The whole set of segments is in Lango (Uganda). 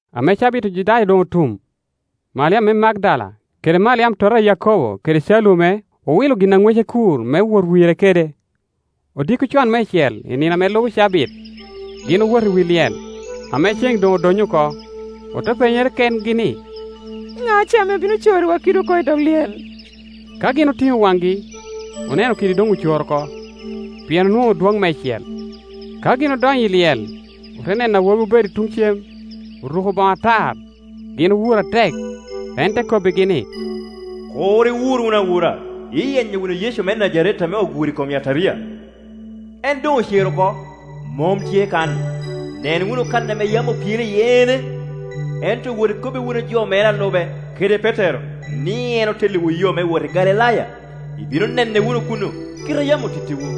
Ame cabit Ojudaya doŋ otum, Maliam me Magdala kede Maliam tota a Yako bo kede Calume owilo gin a ŋwece kur me wot wire kede. Odiko con meicel i ni no ame lubo cabit, gin owoto i wi lyel, ame ceŋ doŋ odonyo oko. Ote penyere kengi ni, “Ŋa ce ame bino corriwa kidi oko i dog lyel?” Ka gin otiŋo waŋgi, oneno kidi doŋ ocoro oko, pien onwoŋo dwoŋ meicel. Ka gin odonyo i Iyel, ote neno awobi obedo i tuŋ cem, oruko boŋo atar; gin owuro atek. En te kobbigi ni, “Kur iwur wunu awura; iyenyo wunu Yecu me Najaret ame oguro i kom yataria. En doŋ ocer oko, mom tye kan; nen wunu kan ame yam opyele iye ene. Ento wot ikobbi wunu jo mere a lube, kede Petero, ni en otelliwu yo me wot i Galilaya; ibino nene wunu kuno, kite a yam otittiwu.”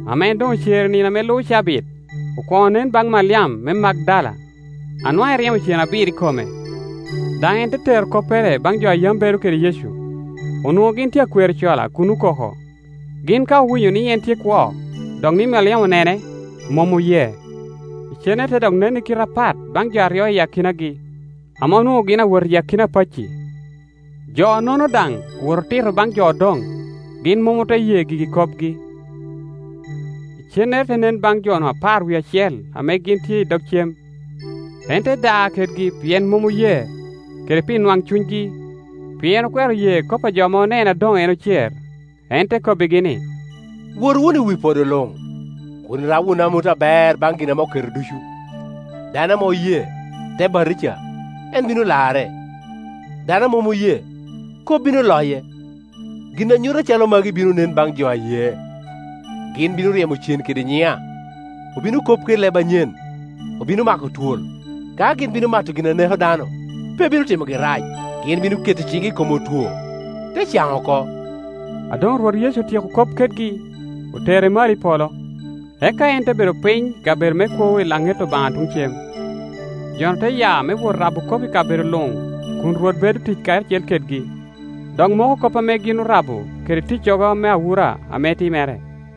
Ame en doŋ ocer i nino ame lubo cabit, okwoŋo nen baŋ Maliam me Magdala, a nwaŋ eryemo cen abiro i kome. Daŋ en te tero koppere baŋ jo a yam bedo kede Yecu; onwoŋo gin tye akwero cola kun okoko. Gin ka owinyo ni en tye kwo, dok ni Maliam onene, mom oye. Icennere te dok nen i kite apat baŋ jo aryo I akinagi, ame anwoŋo gin awot i akina pacci. Jo-nono daŋ owoŋo, otito baŋ jo odoŋ, gin mom ote ye gigi kopgi. Icennere te nen baŋ jo-nu apar wie acel ame gin tye i dog cem. En te da kedgi pien mom oye, kede pi nwaŋcunygi, pien okwero ye kop a jo ame onene a doŋ en ocer. En te kobbigi ni, “Wot wunu i wi podo luŋ, kun irabo wunu amut aber baŋ gin ame oketo ducu. Dano ame oye, te batija, en bino larre; dano a mom oye, kop bino loye. Gin a nyuto acalo magi bino nen baŋ jo a ye: gin bino ryemo cen kede nyiŋa, obino kop kede leb anyen, obino mako twol; ka gin bino mato gin a neko dano, pe bino timogi rac; gin bino keto ciŋgi i kom otwo, te caŋ oko.” A doŋ Rwot Yecu otyeko kop kedgi, otere malo i polo, eka en te bedo piny i kabedo me kwogo i laŋet Obaŋa tuŋ cem. Jo-nu te ya me wot rabo kop i kabedo luŋ, kun Rwot bedo tic karacel kedgi, dok moko kop ame gin orabo kede ticcogo me awura ame timere.]